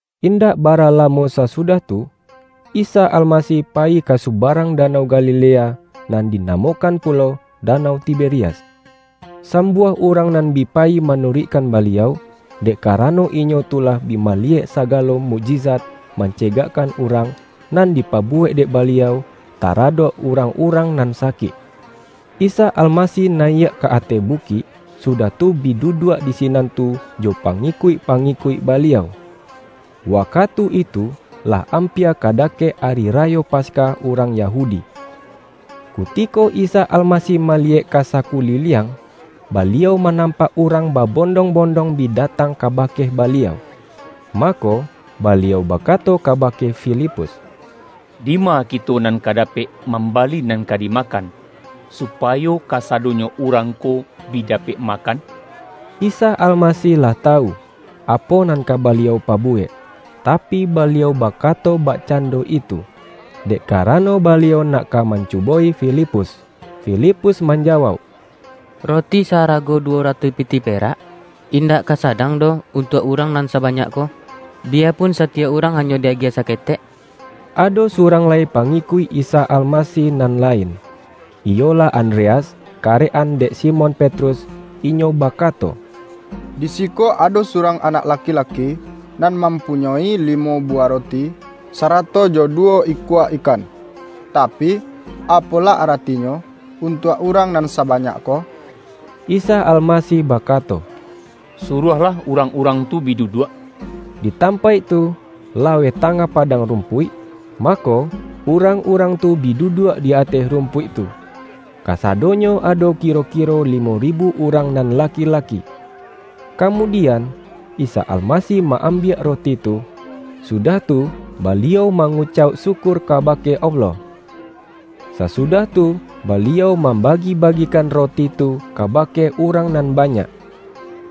Indak bara lamo sasudah tu, Isa Almasih payi ka subarang Danau Galilea, nan dinamokan pulo Danau Tiberias. Sambuah urang nan bi payi manuruikkan Baliau, dek karano inyo tu lah bi maliyek sagalo mukjizat man-cegakkan urang, nan dipabuwek dek Baliau, taradok urang-urang nan sa-kik. Isa Almasih nayiak ka ateh bu-kik, sudah tu bi duduak di sinan tu jo pangikuik-pangikuik Baliau. Wakatu itu, lah ampia ka dakek Ari Rayo Pas-kah urang Yahudi. Kutiko Isa Alma-sih maliyek ka sakuliliang, Baliau ma-nampak urang babondong-bondong bi datang kabake Baliau. Mako, Baliau bakato kabake Filipus,”Dima kito nan ka dapek mambali nan ka dimakan, supayo kasadonyo urang ko bi dapek makan?” ( Isa Almasih lah tawu, apo nan ka Baliau pabuwek, tapi, Baliau ba-kato bakcando itu, dek karano Baliau nak ka mancubo-i Filipus.) Filipus manjawauk,”Roti sa-arago duwo ratuih pitih perak, indak ka sa-dang doh untuak urang nan sabanyak ko, biya pun satiyok urang hanyo di-agiah saketek.” Ado surang lai pangikuik Isa Almasih nan lain, iyolah Andreas, karek-an dek Simon Petrus, inyo bakato, ”Di siko ado surang anak laki-laki, nan mam-punyoi limo buwah roti, sarato jo du-wo ikua ikan. Tapi, apolah aratinyo, untuak urang nan sabanyak ko?” Isa Almasih bakato,”Suruahlah urang-urang tu bi duduak.” Di tampaik tu, laweh tangah padang rumpuik, mako, urang-urang tu bi duduak di ateh rumpuik tu — kasadonyo ado kiro-kiro limo ribu urang nan laki-laki. Kamudian, Isa Almasih ma-ambiak roti tu, sudah tu Baliau mangucauk syukur kabake Allah. Sasudah tu Baliau mambagi-bagikan roti tu kaba-ke urang nan banyak.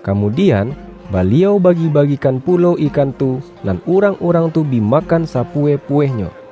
Kamudian, Baliau bagi-bagikan pulo ikan tu, nan urang-urang tu bi makan sapuweh-puwehnyo.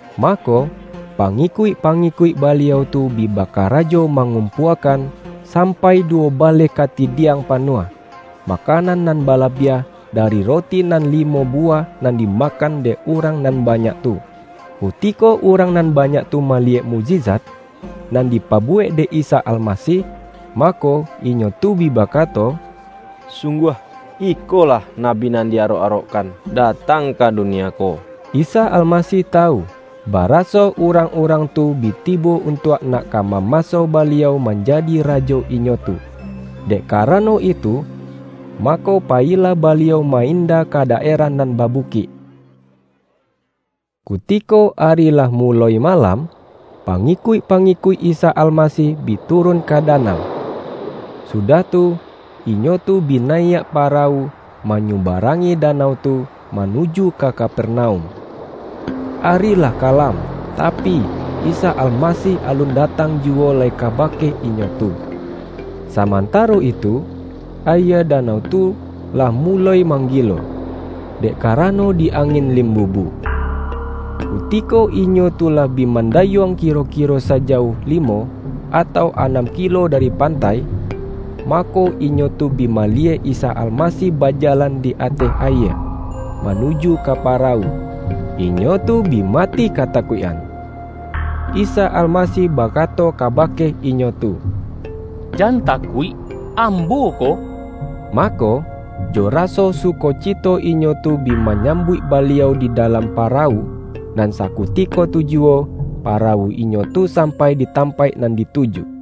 Mako, pangikuik-pangikuik Baliau tu bi baka-rajo mangumpuakan, sampai duwo ba-leh katidiang panuah, makanan nan ba-labiah, dari roti nan limo buwah, nan dimakan dek urang nan banyak tu. Kutiko urang nan banyak tu maliyek mukjizat, nan dipabuwek dek Isa Almasih, mako, inyo tu bi bakato,”Sungguah, ikolah Nabi nan di arok-arokkan datang ka dunia ko!” Isa Almasih tawu, ba-raso urang-urang tu bi tibo untuak nak ka mamaso Baliau manjadi rajo inyo tu. Dek karano itu, mako payilah Baliau ma-inda ka daerah nan babukik. Kutiko ari lah muloi malam, pangi-kuik-pangikuik Isa Almasih bi turun ka danau. Sudah tu, inyo tu bi nayiak pa-rawu manyubarangi danau tu, manu-ju ka Kapernaum. Ari lah kalam, tapi, Isa Almasih alun datang juwo lai kaba-ke inyo tu. Samantaro itu, ayie danau tu lah muloi manggilo, dek karano di angin limbubu. Kutiko inyo tu lah bi mandayuang kiro-kiro sajauh limo, atau anam kilo dari pantai, mako, inyo tu bi maliyek Isa Almasih bajalan di ateh ayie, manuju ka parawu. Inyo tu bi mati kata-kuik-an. Tapi, Isa Almasih bakato ka-bake inyo tu,”Jan takuik, Ambo ko!” Mako, jo raso sukocito inyo tu bi ma-nyambuik Baliau di dalam parawu, nan sakutiko tu juwo, parawu inyo tu sampai di tampaik nan dituju.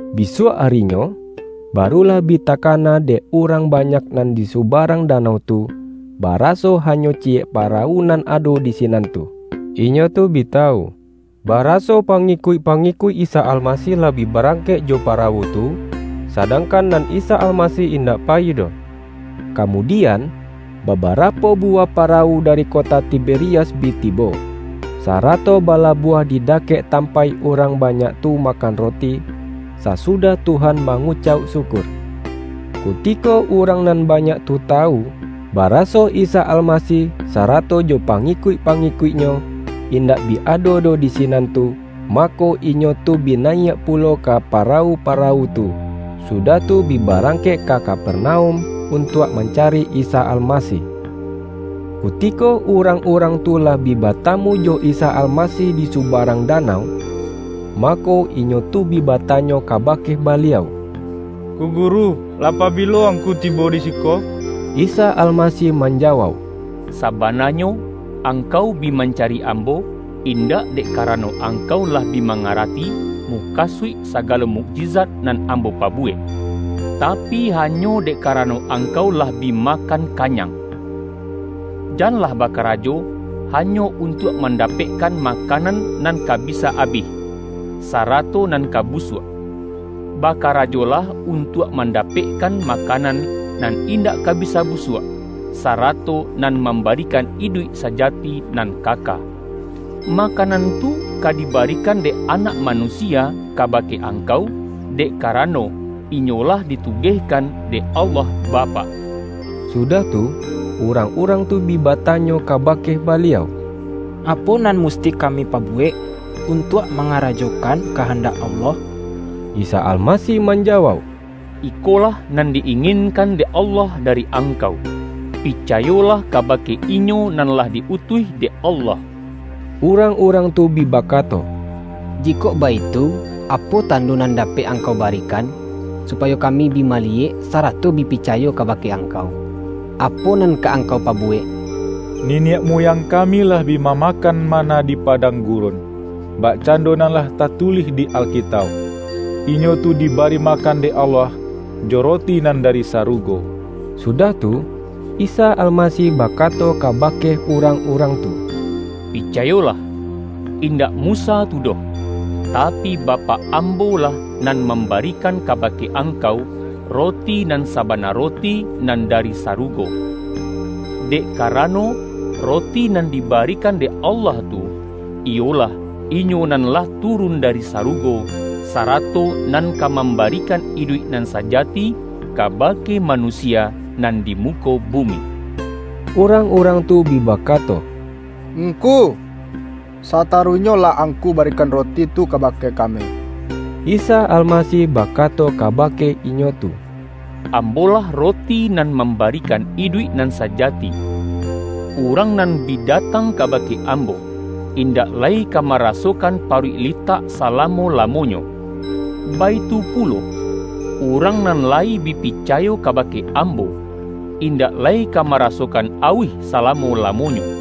Bisuak arinyo, barulah bi takana dek urang banyak nan di subarang da-nau tu, baraso hanyo ciyek parawu nan ado di sinan tu. Inyo tu bi tawu, baraso pangikuik-pangikuik Isa Almasih lah bi barangkek jo parawu tu, sadangkan nan Isa Almasih indak payi doh. Kamudi-an, babarapo buwah parawu dari kota Ti-berias bi tibo, sarato balabuah di dakek tampaik urang banyak tu makan roti, sa-sudah Tuhan mangucauk syukur. Kuti-ko urang nan banyak tu tawu, baraso Isa Almasih sarato jo pangikuik-pangikuik-Nyo, indak bi ado doh di sinan tu, mako, inyo tu bi nayiak pulo ka parawu-parawu tu, sudah tu bi barangkek ka Kapernaum, untuak mancari Isa Almasih. Kutiko urang-urang tu lah bi ba-tamu jo Isa Almasih di subarang da-nau, mako, inyo tu bi batanyo kabake Baliau,”Ngku Guru, lah pabilo Ngku tibo di siko?” Isa Almasih manjawauk,”Sabana-nyo, angkau bi mancari Ambo, indak dek karano angkau lah bi mangarati, mukasuik sagalo mukjizat nan Ambo pabuwek, tapi,hanyo dek karano ang-kau lah bi makan kanyang. Janlah bakarajo hanyo untuak mandapek-kan makanan nan ka bisa abih, sara-to nan ka busuak. Bakarajolah untuak mandapekkan makanan, nan indak ka bisa busuak, sarato nan mambarikan iduik sajati nan kaka. Makanan tu ka dibarikan dek Anak Manusia kabake angkau, dek karano, Inyo lah di tu-gehkan dek Allah Bapak.” Sudah tu, urang-urang tu bi ba-tanyo kabake Baliau,”Apo nan mus-ti kami pabuwek, untuak mangarajo-kan kahandak Allah?” Isa Almasih manjawauk,”Ikolah nan di-inginkan dek Allah dari ang-kau: picayolah kabake Inyo nan lah di-utuih dek Allah.” Urang-urang tu bi bakato,”Jikok baitu, apo tando nan dapek Angkau ba-rikan, supayo kami bi maliyek, sarato bi picayo kabake Angkau? Apo nan ka Angkau pabuwek? Niniak muyang kami lah bi mamakan manna di pa-dang gurun, bakcando nan lah tatulih di Alkitauk, ’Inyo tu dibari makan dek Allah, jo roti nan dari sarugo.’” Sudah tu, Isa Almasih bakato ka-bake urang-urang tu,”Picayolah: In-dak Musa tu doh, tapi, Bapak Ambo-lah nan mambarikan kabake angkau, Roti nan sabana Roti, nan dari saru-go. Dek karano, Roti nan dibarikan dek Allah tu, iyolah, Inyo nan lah tu-run dari sarugo, sarato nan ka mam-barikan iduik nan sajati kabake ma-nusia nan di muko bumi.” Urang-urang tu bi bakato,”Ngku, sataruihnyolah Angku barikan Roti tu kabake kami.” Isa Almasih bakato kabake inyo tu,”Ambo-lah Roti nan mambarikan iduik nan sajati. Urang nan bi datang kabake Ambo, indak lai ka marasokan paruik li-tak salamo-lamonyo. Baitu pulo, urang nan layi bi picayo kabake Ambo, indak lai ka marasokan auih salamo-lamonyo.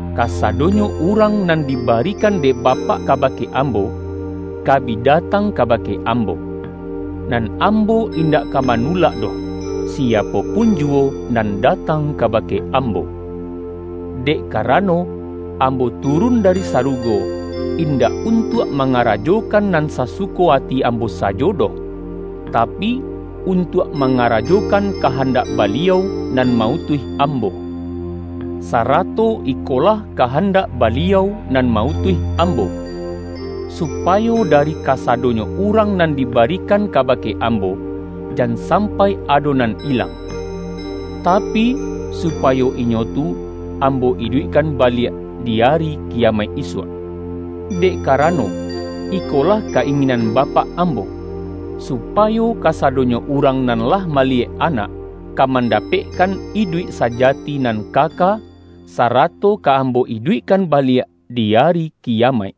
Kasado-nyo urang nan dibarikan dek Bapak kabake Ambo, ka bi datang kabake Ambo. Nan Ambo indak ka manulak doh, siapo pun juwo nan datang kaba-ke Ambo. Dek karano, Ambo turun dari sarugo, indak untuak mangara-jokan nan sasuko ati Ambo sajo doh, tapi, untuak mangarajokan kahandak Baliau nan ma-utuih Ambo. Sarato ikolah kahandak Baliau nan ma-utuih Ambo: supayo dari kasadonyo urang nan dibarikan kabake Ambo, jan sam-pai ado nan ilang; tapi supayo inyo tu Ambo iduikkan baliak, di Ari Ki-yamaik isuak. Dek karano, ikolah ka-inginan Bapak Ambo: Supayo ka-sadonyo urang nan lah maliyek Anak, ka mandapekkan iduik sajati nan ka-ka, sarato ka Ambo iduikkan baliak di Ari Kiyamaik.”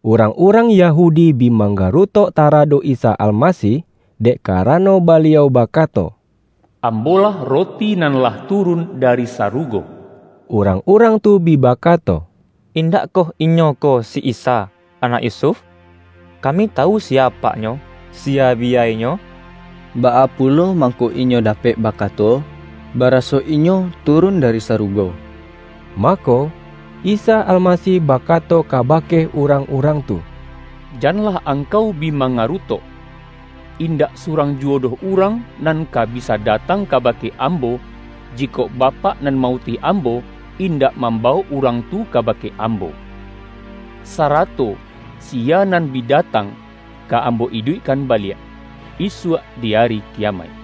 Urang-urang Yahudi bi mangga-rutok taradok Isa Almasih, dek ka-rano Baliau bakato:”Ambo-lah Roti nan lah turun dari sarugo.” Urang-urang tu bi bakato,”Indak koh Inyo ko si Isa, anak Yusuf? Kami tawu si-ya apak-Nyo, siya biyai-Nyo! Baa pu-lo mangko Inyo dapek bakato, bara-so Inyo turun dari sarugo?” Mako, Isa Almasih bakato kaba-ke urang-urang tu,”Janlah angkau bi manggarutok. Indak surang juwo doh urang nan ka bisa datang kaba-ke Ambo, jikok Bapak nan ma-utuih Ambo, indak mambawok urang tu ka-bake Ambo. Sarato siya nan bi datang, ka Ambo iduikkan baliak, isuak di Ari Kiyamaik.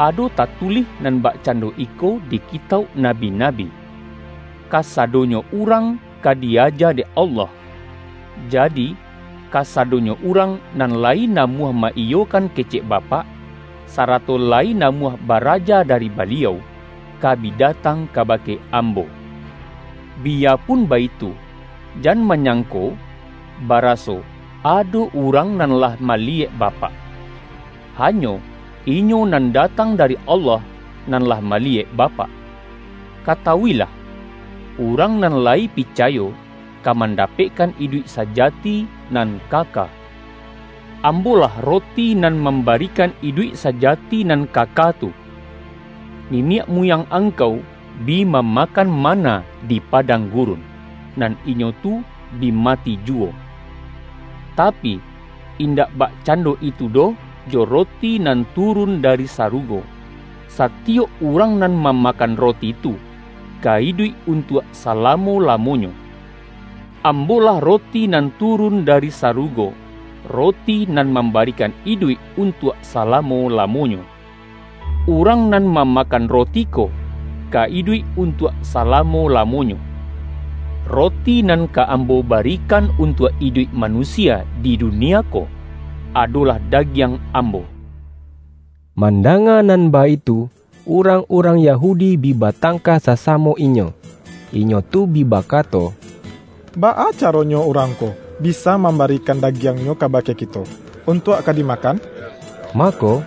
Ado tatulih nan bakcan-do iko di kitauk nabi-nabi: ’Kasadonyo urang ka di-aja dek Allah.’ Jadi, kasa-donyo urang nan layi namuah ma-iyo-kan kecek Bapak, sarato layi namuah baraja dari Baliau, ka bi datang kabake Ambo. Biyapun baitu, jan manyangko baraso ado urang nan lah maliyek Bapak. Hanyo, Inyo nan datang dari Allah, nan lah maliyek Bapak. Katawuilah: Urang nan layi pi-cayo, ka mandapekkan iduik saja-ti nan kaka. Ambo-lah Roti nan mambarikan iduik sajati nan kaka tu. Niniak muyang angkau, bi mama-kan manna di padang gurun, nan inyo tu bi mati juwo. Tapi, indak bak-cando itu doh jo Roti nan turun dari sarugo. Satiyok urang nan mamakan Roti tu, ka iduik untuak salamo-lamo-nyo. Ambo-lah Roti nan turun dari sarugo Roti nan mambarikan iduik untuak salamo-lamonyo. Urang nan mamakan Roti ko, ka iduik untuak sa-lamo-lamonyo. Roti nan ka Ambo ba-rikan untuak iduik manusia di dunie ko, adolah dagiang Ambo.” Mandanga nan baitu, urang-urang Yahudi bi batangka sasamo inyo. Inyo tu bi bakato,”Baa caronyo Urang ko bisa mambarikan dagiang-Nyo kaba-ke kito, untuak ka dimakan?” Mako,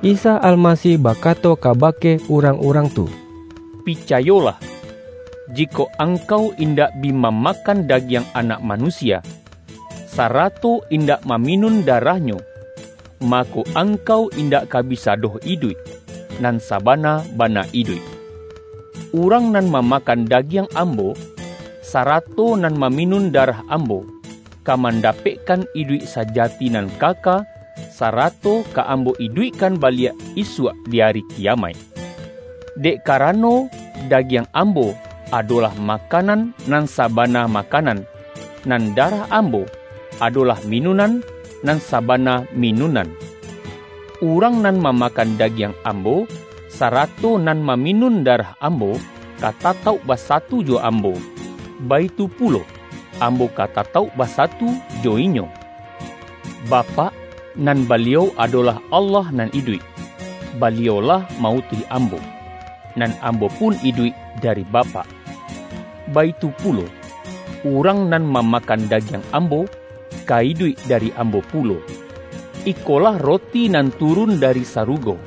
Isa Almasih bakato kabake urang-urang tu,”Picayolah: Jikok ang-kau indak bi mamakan dagiang Anak Manusia, sarato indak maminun da-rah-Nyo, mako, angkau indak ka bi-sa doh iduik, nan sabana-bana iduik. Urang nan mamakan dagiang Ambo, sarato nan maminun darah Ambo, ka mandapekkan iduik sajati nan kaka, sarato ka Ambo iduikkan baliak isuak di Ari Kiyamaik. Dek karano, da-giang Ambo, adolah makanan nan sa-bana makanan, nan darah Ambo, ado-lah minunan, nan sabana minunan. Urang nan mamakan dagiang Am-bo, sarato nan maminun darah Ambo, ka tatauk basatu jo Ambo, baitu pulo, Ambo ka tatauk basatu jo inyo. Bapak, nan Baliau adolah Allah nan iduik, Baliau lah ma-utuih Ambo, nan Am-bo pun iduik dari Bapak. Baitu pulo, urang nan mamakan dagiang Ambo, ka iduik dari Ambo pulo. Ikolah Roti nan turun dari sarugo: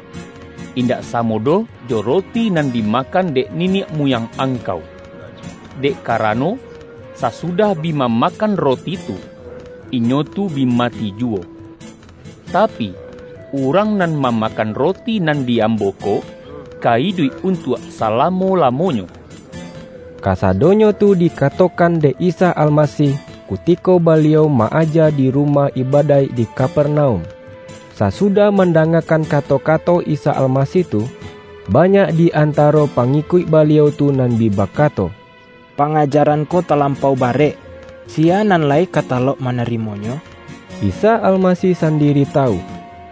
indak samo doh jo roti nan dimakan dek niniak muyang angkau. Dek karano, sasudah bi mamakan roti tu, inyo tu bi mati juwo. Tapi, urang nan mamakan Roti nan di Ambo ko, ka iduik untuak sa-lamo-lamonyo.” Kasadonyo tu dikatokan dek Isa Almasih, kutiko Baliau ma-aja di ru-mah ibadaik di Kapernaum. Sasudah mandangakan kato-kato Isa Almasih tu, banyak di antaro pa-ngikuik Baliau tu nan bi bakato,”Pa-ngajaran ko talampau barek. Siya nan lai ka talok manarimonyo!” Isa Almasih sandiri tawu,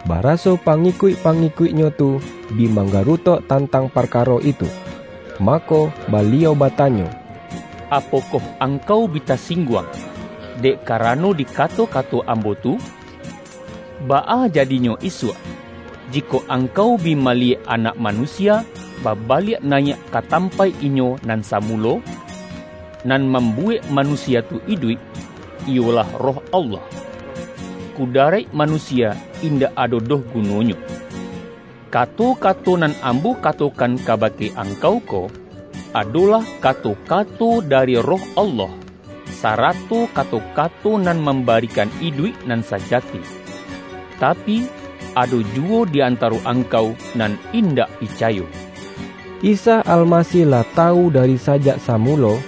baraso pangikuik-pangikuik-Nyo tu bi mang-garutok tantang parkaro itu. Mako, Baliau batanyo,”Apokoh angkau bi tasingguang, dek karano di kato-kato Ambo tu? Baa jadinyo isuak, jikok angkau bi maliyek Anak Manusia, ba-baliak nayiak ka tampaik Inyo nan sa-mulo? Nan mambuwek manusia tu iduik, iyolah Roh Allah. Kudaraik ma-nusia indak ado doh gunonyo. Kato-ka-to nan Ambo katokan kabake angkau ko, adolah kato-kato dari Roh Allah, sarato kato-kato nan mambarikan iduik nan sajati. Tapi, ado juwo di antaro angkau nan indak picayo.” (Isa Almasih lah tawu dari sajak samulo,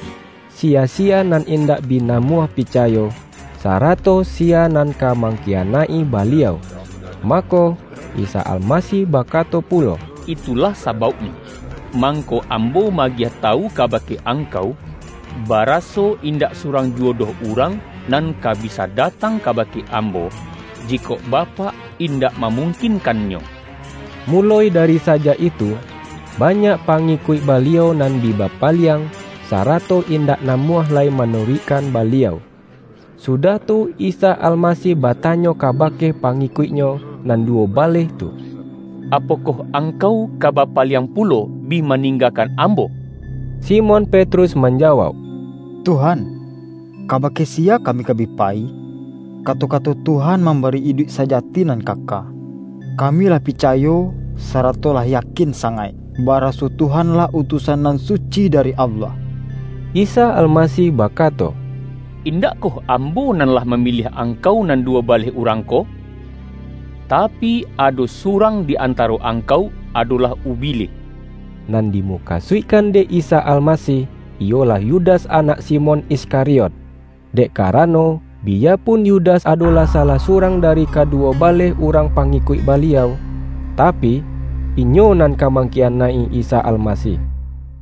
siya-siya nan indak bi namuah picayo, sarato siya nan ka mangkiyanaik-i Baliau.) Mako, Isa Almasih bakato pulo,”Itu-lah sabauknyo, mangko Ambo ma-agiah tawu kabake angkau, baraso indak surang juwo doh urang nan ka bisa datang kabake Ambo, jikok Bapak indak mamungkinkannyo.” Muloi dari sajak itu, banyak pa-ngikuik Baliau nan bi bapaliang, sarato indak namuah lai manuruikkan Baliau. Sudah tu Isa Almasih batanyo ka-bake pangikuik-Nyo nan duwo baleh tu,”Apokoh angkau ka bapaliang pu-lo, bi maninggakan Ambo?” Simon Petrus manjawauk,”Tuhan, kabake siya kami ka bi payi? Kato-ka-to Tuhan mambari iduik sajati nan ka-ka. Kami lah picayo, sarato lah ya-kin sangaik, baraso Tuhan-lah Utusan Nan Suci dari Allah.” Isa Almasih bakato,”Indakkoh Ambo nan lah mamiliah angkau nan duwo baleh urang ko? Tapi, ado su-rang di antaro angkau adolah ubilih!” Nan dimukasuikkan dek Isa Almasih, iyolah Yudas anak Simon Iskariot. Dek karano, biyapun Yudas adolah salah surang dari kaduwo baleh urang pa-ngikuik Baliau, tapi inyo nan ka mang-kiyanaik-i Isa Almasih. YAHYA